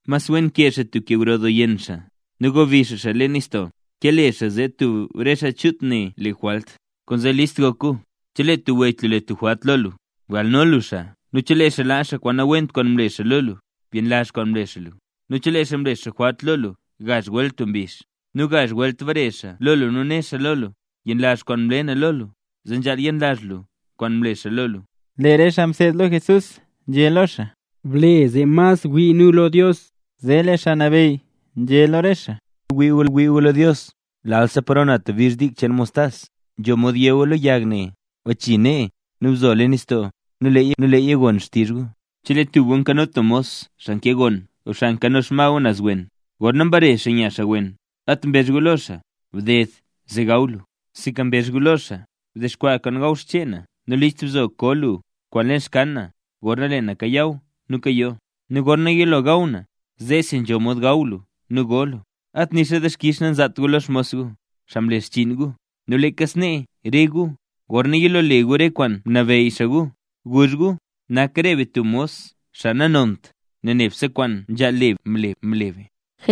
Mas wen kee xaa tub ke gro doo yenn xaa nu gobi xaa xaa leen nistoo, ke le xaa zee tub re xaa chut ne le jwalt. Kwaanzee ¡list gok gu! Chelee tub wech lu le tub jwalt lo lu, bgalno lu xaa nu chelee xaa laa xaa kwaan nawent kwaan mle xaa lu, byenlazh kwaan mle xaa lu. Nu chelee xaa mle xaa jwalt lo lu gazh welt tub mbizh, nu gazh welt bare xaa lo lu nu né xaa lo lu: “Yenlazh kwaan mle na lo lu”, zee nzhaal yenlazh lu kwaan mle xaa lu. Lee re xaa mseed lo Jesús nzhé lo xaa: —Ble zee mas wii nu lo Dios. Zee lee Xaa Nabeyy nzhé lo re xaa: —Chelee gu ngwii gu lo Dios, lalsa paro na tub bizh dik cheen mostas, nzho mod yé gu lo yag ne: “Bachii nee nu bzo axta leen nistoo”, nu leeya gon xtizh gu. ’Chelee tub gu nkano tub mos xaa nkee goon o xaa nkano xma gu naz wen, gorna mbare xaa nya xaa wen, at nambezht gu lo xaa: “Bded zee gaw lu”; sinka mbezh gu lo xaa: “Bdexkwaa kwaan gaw xchee na nu list bzo koo lu kwaan leen xkyann na gorna lee na kayaw nu kayoo. Nu gorna yilo gaw na zeesi nzho mod gaw lu nu go lu.” At nixa dixkix nanzaat gu lo xmos gu, xaa mle xchiin gu. Nu leeka snee re gu, gorna yilo le gu re kwaan mnabeyy xaa gu, guzh gu: “Nak re be tub mos xaa nanont, nel nebse kwaan nzhaal le be, mle be”.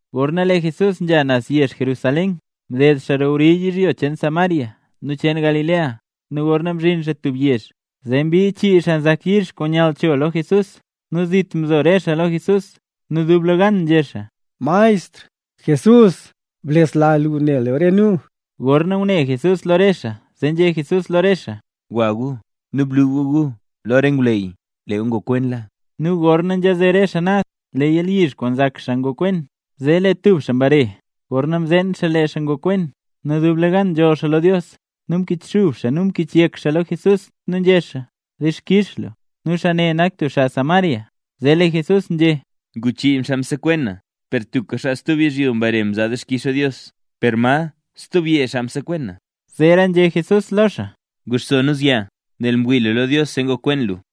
Gorna lee Jesús nzha naz yezh Jerusalén, mded xaa roo wri yizhyo cheen Samaria nu cheen Galilea. Nu gorna mzhin xaa tub yezh, zee mbii chii xaa nzak yalyizh kwaan nyall cho lo Jesús. Nu zit mzo re xaa lo Jesús. Nu dublegan nzhé xaa: —¡Maestr! ¡Jesús! ¡Blesla lu ne lu re nu! Gorna ngune Jesús lo re xaa zee nzhé Jesús lo re xaa: —Gwa gu nu blu gu gu lo re ngwleyy, lee gu ngokwenla. Nu gorna nzhaze re xaa naz, lee yalyizh kwaan nzak xaa ngokwen. Zee lee tub xaa mbare, gorna mzeen xaa lee xaa ngokwen, nu dublegan nzholl xaa lo Dios, nu mkichxub xaa nu mkichyek xaa lo Jesús, nu nzhé xaa: —Dixkix lu. Nu xaa ne nak tub xaa Samaria. Zee lee Jesús nzhé: —Ngu chii xaa msekwen na per tubka xaa stub yizhyo mbare mzaa dixkix lo Dios. ¿Per ma stub yee xaa msekwen na? Zeera nzhé Jesús lo xaa: —Guxso nu zyaa. Nel mwii lu lo Dios zee ngokwen lu.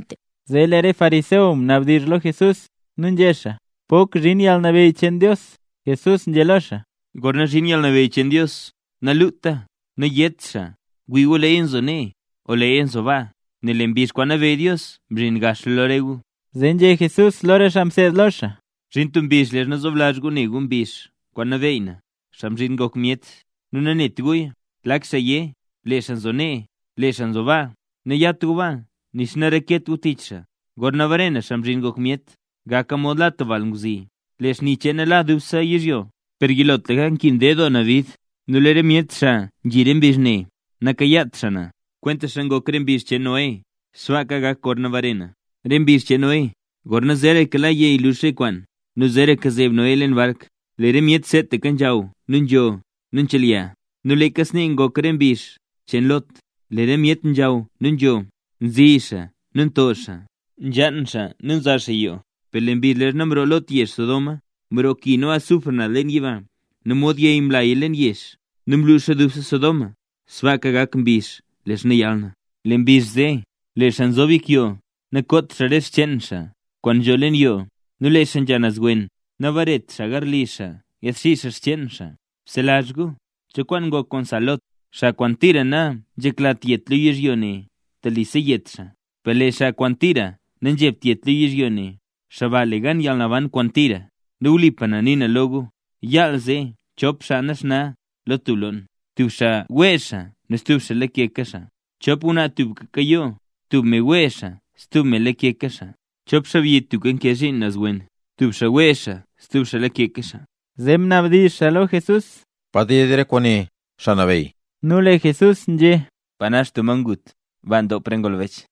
Zee lee re xaa fariseo mnabdizh lo Jesús nu nzhé xaa: —¿Pok zhin yalnabeyy cheen Dios? Jesús nzhé lo xaa: —Gorna zhin yalnabeyy cheen Dios, naluta. Nayét xaa: “¡Wii gu, leeya nzo nee!” o “¡Leeya nzo baa!” Nel lee mbizh kwaan nabeyy Dios mzhin gaxla lo re gu. Zee nzhé Jesús lo re xaa mseed lo xaa: —Zhin tub mbizh leezha zoblazh gu ne gu mbizh kwaan nabeey na, Xaa Mzhin Ngok Myet, nu nanet guya. Lak xaa yé: “Lee xaa nzo nee, lee xaa nzo baa”, nayat gu baa nixa nareket gu tich xaa. Gorna bare na, Xaa Mzhin Ngok Myet, gaka mod la tub balngwzi; lee xni cheena la dubse yizhyo. Per yilotlaka nkin ded doo na bid, nu lee re myet xaa nzhi re mbizh ne, nakayaat xaa na. Kwentaxa ngok re mbizh cheen Noé, sbaaka gak gorna bare na. Re mbizh cheen Noé, gorna zeeraka la yey lux re kwaan nu zeeraka zeeb Noé leen bark, lee re myet seetaka nzhaw nu nzho nu nchelya. Nu leeka snee ngok re mbizh cheen Lot, lee re myet nzhaw nu nzho, nzi xaa nu nto xaa, nzhaan xaa nu nza xaa yoo. Per lee mbizh leezha mroo Lot yezh Sodoma, mroo ki nu azufre naz leen yiba nu mod yey mlaya leen yezh, nu mluxa dubse Sodoma. Sbaaka gak mbizh leezha yal na. Lee mbizh zee, lee xaa nzob yek yoo, nakoot xaa re xcheen xaa kwaan nzho leen yoo, nu lee xaa nzha naz wen, nabaretra xaa garli xaa yaadxii xaa xcheen xaa. ¡Bselazh gu cho kwaan ngok kwaan sa Lot! Xaa kwaan tira nanzheklat yet lo yizhyo ne telisa yet xaa, per lee xaa kwaan tira nanzhebt yet lo yizhyo ne, xaa ba le gan yalnaban kwaan tira. Nu wlipa na nii na lo gu, yaal zee chop xaa naxna lo tub loon, tub xaa wee xaa nu stub xaa lake xaa. Chop ngwnaa tubka nkayoo; tub me wee xaa stub me lakeka xaa. Chop xaabyi tubka nkee zhiin naz wen; tub xaa wee xaa nu stub xaa lakeka xaa. Zee mnabdizh xaa lo Jesús: —¿Pa ded re kwaane, Xaa Nabeyy? Nu lee Jesús nzhé: —Pa nax tub ma ngut, baa ndop re ngolbech.